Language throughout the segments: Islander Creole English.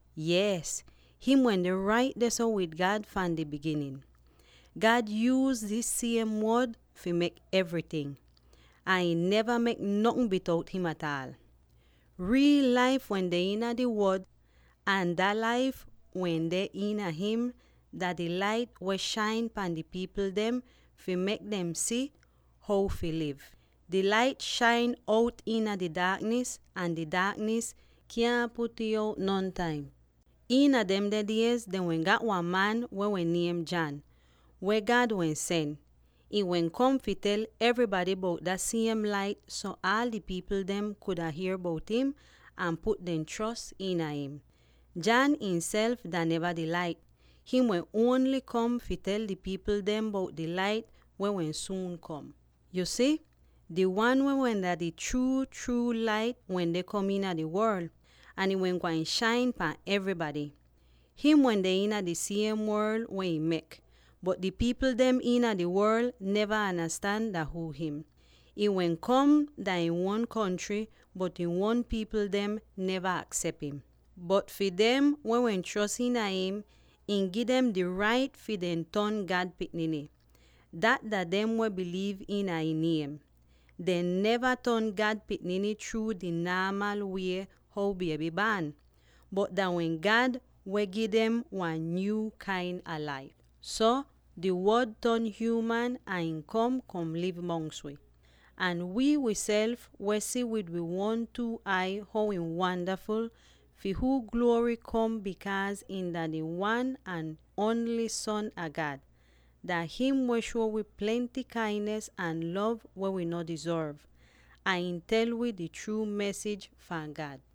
Yees, him wende rait dehso wid God fahn di biginin. God yuuz dis siem Wod fi mek evryting —ahn ihn neva mek notn bitout him ataal. Riil laif wende iina di Wod, ahn dah laif weh deh iina him dah di lait weh shain pahn di pipl dem fi mek dem si how fi liv. Di Lait shain out iina di daaknis ahn di daaknis kyaahn put'ih out nontaim. Iina demde diez dehn wehn gat wan man weh wehn niem John, weh God wehn sen. Ihn wehn kom fi tel evrybady bout dah siem Lait so aal di pipl dem kuda hier bout im ahn put dehn chros iina im. John ihnself dah neva di Lait; him wehn ongl kom fi tel di pipl dem bout di Lait weh wehn suun kom. Yu si, di Wan weh dah wehn di chruu Lait wende kom iina di worl, ahn ihn wehn gwain shain pahn evrybady. Him wende iina di siem worl weh ihn mek, bot di pipl dem iina di worl neva andastan dah huu him. Ihn wehn kom mongs ihn uon pipl, bot ihn uon pipl dem neva aksep im. Bot fi dem weh wehn chros iina im, ihn gi dem di rait fi dehn ton God pikniny; dat dah dem weh biliiv iina ihn niem. Dehn neva ton God pikniny chruu di naamal wie how bieby baan laik how man du'ih, bot dah wehn God ihnself gi dem wan nyuu kain a laif. So, di Wod ton hyuuman ahn ihn kom, kom liv mongs wi. Ahn wii wiself wehn si wid wi uon two ai how ihn wandaful, fi huu gluory kom bikaaz ihn dah di Wan ahn ongl Son a God. Dah him weh shuo wi plenty kainis ahn lov weh wi no dizorv, ahn ihn tel wi di chruu mesij fahn God.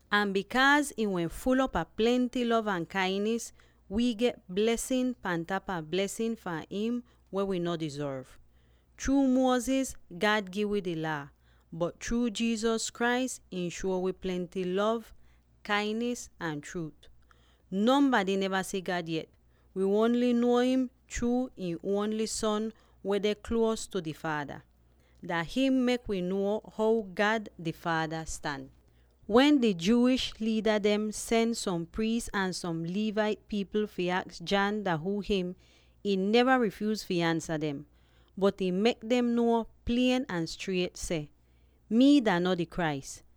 Ahn bikaaz God wehn ful'op a plenty lov ahn kainis, wi get blesin pan tapa blesin fahn im weh wi no dizorv. Chruu Moses God gi wi di Laa, bot chruu Jesus Christ ihn shuo wi plenty lov, kainis ahn chruut. Nonbady neva si God yet; wi ongl nuo im chruu ihn ongli'is Son weh deh nier tu di Faada. Dah him mek wi nuo how God di Faada stan. Wen di Jewish liida dem sen som priis ahn som Levite pipl fi aks John dah huu him, ihn neva rifyuuz fi ansa dem. Bot ihn mek dem nuo klier ahn striet seh, “Mii dah no di Christ.”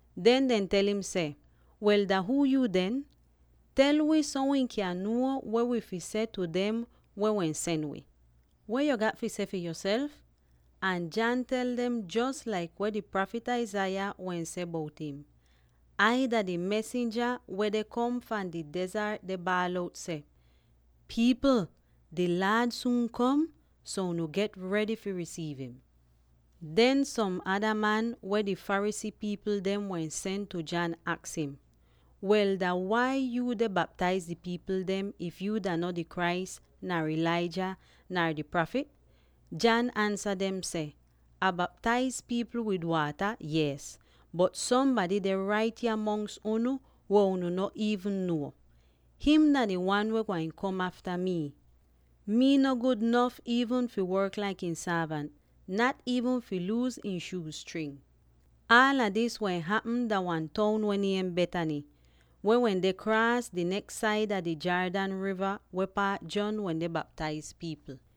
Den dehn tel im seh, “Wel, dah huu yuu den? Tel wi so wi kyan nuo weh wi fi seh tu dem weh sen wi. Weh yo gat fi seh fi yoself?” Ahn John tel dem jos laik weh di prafit Isaiah wehn seh bout im, “Ai dah di mesinja weh deh kom fahn di dezart deh baal out seh: ‘Pipl! Di Laad suun kom, so unu get redy fi risiiv im!’” Den som ada man, weh di Pharisee pipl dem wehn sen tu John, aks im, “Wel, dah wai yuu deh baptaiz di pipl dem, if yuu dah no di Christ, nar Elijah, nar di Prafit?” John ansa dem seh, “Ah baptaiz pipl wid waata, yees, bot sombady deh rait yah mongs unu, weh unu no iivn nuo. Him dah di Wan weh gwain kom afta mi; mii no gud nof iivn fi work laik ihn sorvant, nat iivn fi luus ihn shuuz string.” Aala dis wehn hapm dah wan toun weh niem Bethany, weh wende kraas di neks saida di Jordan riva weh paat John wende baptaiz pipl.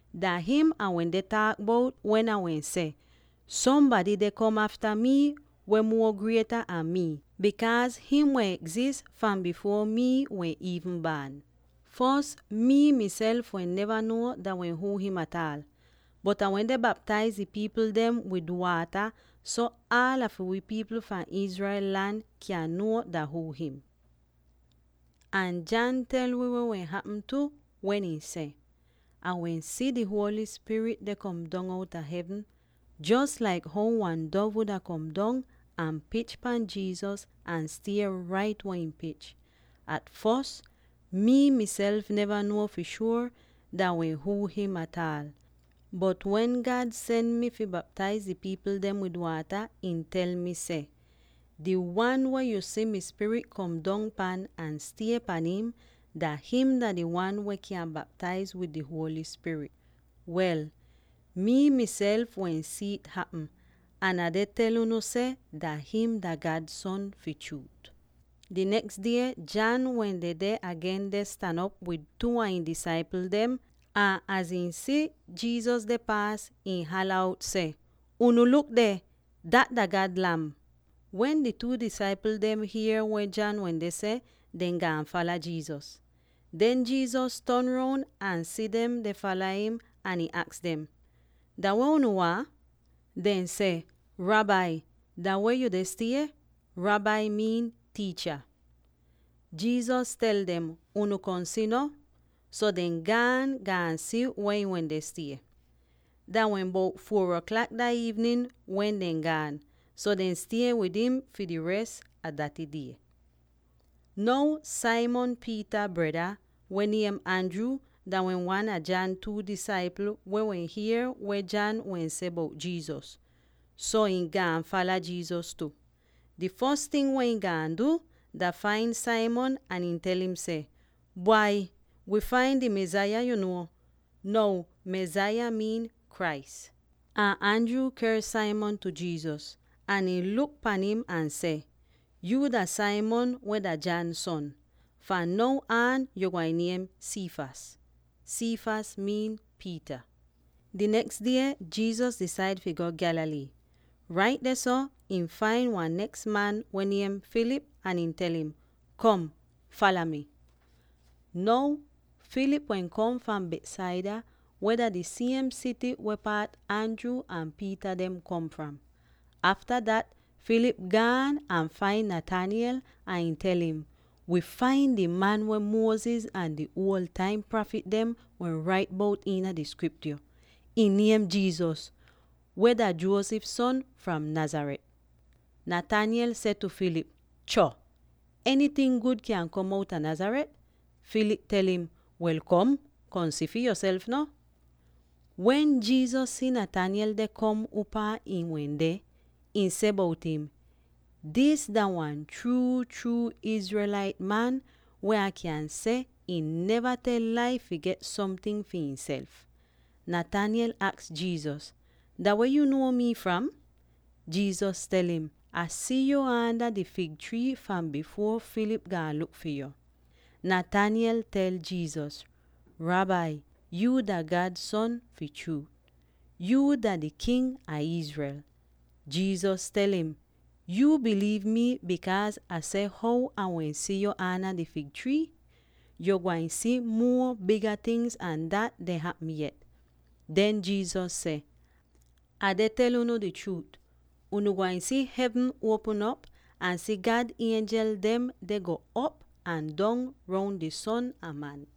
Dah him Ah wende taak bout wen Ah wehn seh, ‘Sombady deh kom afta mi weh muo grieta an mi, bikaaz him wehn egzis bifuor mii wehn iivn baan.’ Fos, mii miself wehn neva nuo dah wehn huu him ataal. Bot Ah wende baptaiz di pipl dem wid waata so aala fi wi pipl fahn Israel lan kyan nuo dah huu him.” Ahn John tel wi weh wehn hapm tu, wen ihn seh, “Ah wehn si di Holy Spirit deh kom dong outa hevn, jos laik how wan dov wuda kom dong, ahn pich pan Jesus ahn stie rait weh ihn pich. At fos, mii miself neva nuo fi shuor dah wehn huu him ataal, bot wen God sen mi fi baptaiz di pipl dem wid waata, ihn tel mi seh, ‘Di Wan weh yu si mi Spirit kom dong pan ahn stie pan im, dah him dah di Wan weh kyan baptaiz wid di Holy Spirit.’ Wel, mii miself wehn si'it hapm, ahn Ah deh tel unu seh dah him dah God Son, fi chruut.” Di neks die John wehn dedeh agen deh stan op wid two a ihn disaipl dem, ahn az ihn si Jesus deh paas, ihn hala out seh, “Unu luk deh! Dat dah God Lam!” Wen di two disaipl dem hier weh John wende seh, dehn gaan fala Jesus. Den Jesus ton roun ahn si dem deh fala im, ahn ihn aks dem, “Dah weh unu waahn?” Dehn seh, “Rabbi, dah weh yuu deh stie?” (Rabbi miin “Tiicha.”) Jesus tel dem, “Unu kom si no.” So dehn gaan, gaan si weh ihn wende stie. Dah wehn bout four aklak dah iivnin wen dehn gaan, so dehn stie wid im fi di res a daty die. Now Simon Peter breda, weh niem Andrew, dah wehn wan a John two disaipl weh wehn hier weh John wehn seh bout Jesus. So, ihn gaan fala Jesus tu. Di fos ting weh ihn gaan du, dah fain Simon ahn ihn tel im seh, “Bwai, wii fain di Mesaya yu nuo!” (Now Mesaya miin “Christ.”) Ahn Andrew ker Simon tu Jesus, ahn ihn luk pan im ahn seh, “Yuu dah Simon weh dah John son. Fahn now aan yo gwain niem Cephas.” (Cephas miin “Peter.”) Ahn Peter miin “Rak.” Di neks die Jesus disaid fi go Galilee. Rait dehso ihn fain wan neks man weh niem Philip ahn ihn tel im, “Kom! fala mi!” Now Philip wehn kom fahn Bethsaida weh dah di siem sity weh paat Andrew ahn Peter dem kom fram. Afta dat Philip gaan ahn fain Nathaniel ahn ihn tel im, “Wii fain di wan weh Moses ahn di uol taim prafit dem wehn rait bout iina di Skriptyo. Ihn niem Jesus, weh dah Joseph son, fahn Nazareth.” Nathaniel seh tu Philip, “Cho! Enyting gud kyan kom outa Nazareth?” Philip tel im, “Wel, kom, kom si fi yoself no.” Wen Jesus si Nathaniel deh kom upaa ihn wende, ihn seh bout im, “Dis dah wan chruu Israelite man weh Ah kyan seh ihn neva tel lai fi get somting fi ihnself!” Nathaniel aks Jesus, “Dah weh yuu nuo mii fram?” Jesus tel im, “Ah si yu aanda di fig trii fahn bifuor Philip gaan luk fi yo.” Nathaniel tel Jesus, “Rabbi, yuu dah God Son fi chruut. Yuu dah di King a Israel!” Jesus tel im, “Yuu biliiv mi bikaaz Ah seh how Ah wehn si yu aanda di fig trii? Yo gwain si muo biga tingz an dat deh hapm yet.” Den Jesus seh, “Ah deh tel unu di chruut: unu gwain si hevn uopm op, ahn si God ienjel dem deh go'op ahn dong roun di Son a Man.”